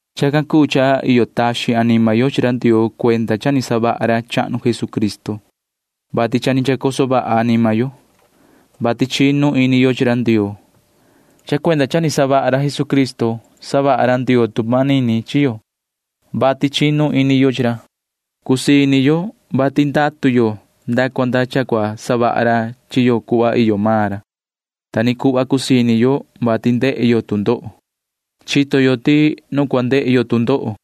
Chacan cuu cha iyo taxin anima yo chi ra Ndioo cuenda cha ni savaha ra chahnu Jesucristo, vati cha ni chacoso vaha anima yo, vati chinu ini yo chi ra Ndioo. Cha cuenda cha ni savaha ra Jesucristo chaha ra Ndioo tu manini chi yo, vati chinu ini yo chi ra. Cusii ini yo, vati ndatu yo nda cua nda cua savaha ra chi yo cuhva iyo maan ra. Ta ni cuhva cusii ini yo, vati ndehe yo tu ndoho. Chito yo ti nu cua ndehe yo tu ndoho,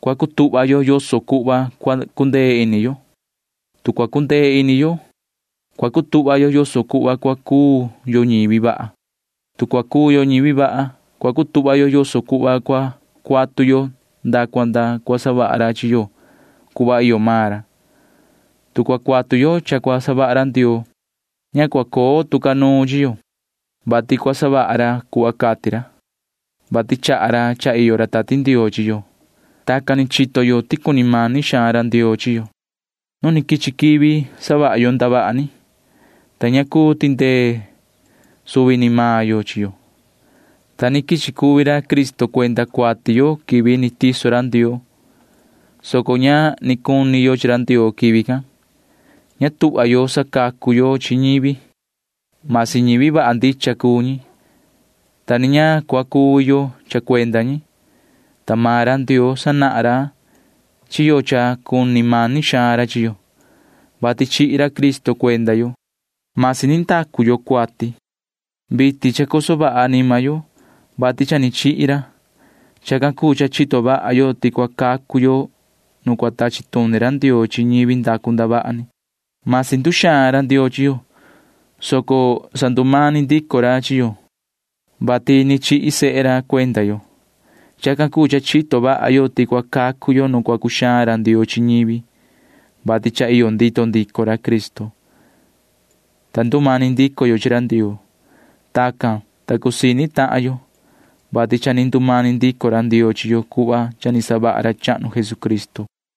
cua cutuhva yo yoso cuhva cua cundee ini yo. Tu cua cundee ini yo, cua cutuhva yo yoso cuhva cua cuu yo ñivi vaha. Tu cua cuu yo ñivi vaha, cua cutuhva yo yoso cuhva cua cuatu yo nda cua nda cua savaha ra chi yo cuhva iyo maan ra. Tu cua cuatu yo cha cua savaha ra Ndioo, ña cua coo tu ca nuun chi yo, vati cua savaha ra cuhva cati ra, vati chaha ra cha iyo ra Tati Ndioo chi yo. Tacan ni chito yo ti cuni mani xaan ra Ndioo chi yo. Ni vii ndacu yo ndavaha ni nu quichi quivi, ta ña ni cuu tindee yo chi yo, ta ni quichi cuvi ra Cristo cuenda cuati yo quivi ni tiso ra Ndioo, [soco ña ni cuni yo chi ra Ndioo quivi can]. Ña tuhva yo sacacu yo chi ñivi―masi ñivi vaha ndicha cuu ñi, tu cua cuvi yo cha cua savaha yo chacan. Ta maan ra Ndioo sanahan ra chi yo ti cuni mani xaan ra chi yo, vati chihi ra Cristo cuenda yo, ta ni vii ndacu yo cuati. Vitin cha chacoso vaha anima yo, vati cha ni chihi ra. Chacan cuu cha chito vaha xaan ca yo ti cua cacu yo nu cua tachi tuni ra Ndioo chi ñivi ndacu ndavaha ni. Ni vii nduxaan yo chi ra Ndioo, ta sandumani ndico ra chi yo, vati chihi sehe ra cuenda yo. Chacan cuu cha chito vaha xaan ca yo ti cua cacu yo nu cua cuxaan ra Ndioo chi ñivi, vati cha iyo ndito ndico ra Cristo, ta ndumani ndico yo chi ra Ndioo. Tacan cuu, ta cusii ini tahan yo, vati cha ni ndumani ndico ra Ndioo chi yo cuhva cha ni savaha ra chahnu Jesucristo.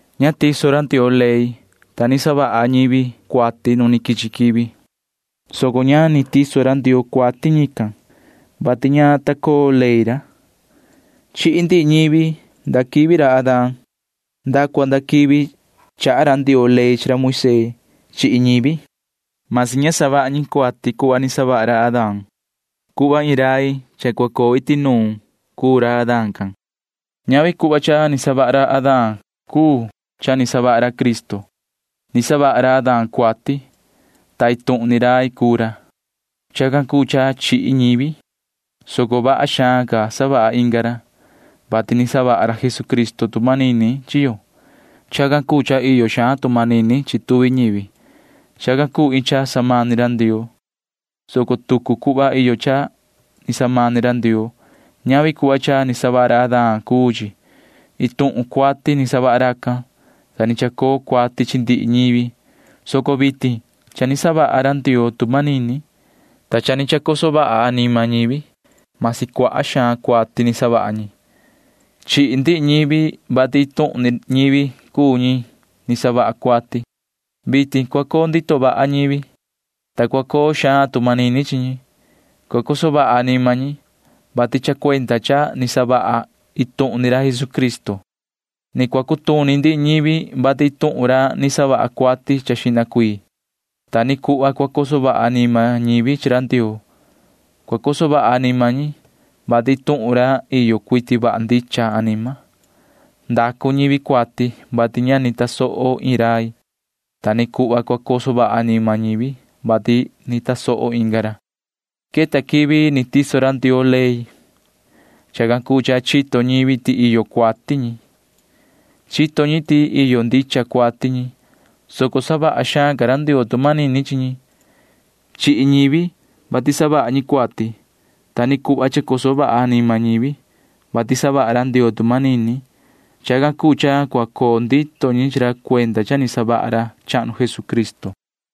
Ña ta tiso ra Ndioo ley, ta ni savaha ñivi cuati nu ni quichi quivi, soco ña ni tiso ra Ndioo cuati ñican, vati ña ta coo ley ra. Chihi ndihi ñivi nda quivi ra Adán nda cua nda quivi chaha ra Ndioo ley chi ra Moisee. Chihi ñivi―masi ña ni savaha ñi cuati cuhva ni savaha ra Adán. Cuhva iin rai cha cua coo iti nuun ca cuu ra Adán can. Ñavi cuhva cha ni savaha ra Adán cuu cha ni savaha ra Cristo. Ni savaha ra Adán cuati, ta iin tuhun ni rai cuu ra. Chacan cuu cha chihi ñivi, soco vaha xaan ca savaha inga ra, vati ni savaha ra Jesucristo tu manini chi yo. Chacan cuu cha iyo xaan tu manini chi tuvi ñivi. Chacan cuu iin cha samani ra Ndioo, soco tucu cuhva iyo cha ni samani ra Ndioo. Ñavi cuhva cha ni savaha ra Adán cuu chi. Iin tuhun ni cuati ni savaha racan, ta ni chacoo cuati chi ndihi ñivi, soco vitin cha ni savaha ra Ndioo tu manini, ta cha ni chacoso vaha anima ñivi―masi cuaha xaan cuati ni savaha ñi. Chihi ndihi ñivi, vati iin tuhun ni ñivi cuu ñi ni savaha cuati. Vitin cua coo ndito vaha ñivi, ta cua coo xaan tu manini chi ñi. Cua coso vaha anima ñi, vati cha cuenda cha ni savaha iin tuhun ni ra Jesucristo. Ni cua cutuni ndihi ñivi, vati iin tuhun ni ra ni savaha cuati xihna ca. Ta ni cuhva cua coso vaha anima ñivi chi ra Ndioo. Cua coso vaha anima ñi, vati iin tuhun ni ra iyo cuiti vaha ndicha anima. Ndacu ñivi cuati, vati ña ni tasoho iin rai. Ta ni cuhva cua coso vaha anima ñivi, vati ni tasoho inga ra. Queta quivi ni tiso ra Ndioo ley. Chacan cuu cha chito ñivi ti iyo cuati ñi. Chito ñi ti iyo ndicha cuati ñi, soco savaha xaan ca ra Ndioo tu manini chi ñi. Chihi ñivi, vati savaha ñi cuati. Ta ni cuhva chacoso vaha anima ñivi, vati savaha ra Ndioo tu manini. Chacan cuu cha cua coo ndito ni chi ra cuenda cha ni savaha ra chahnu Jesucristo.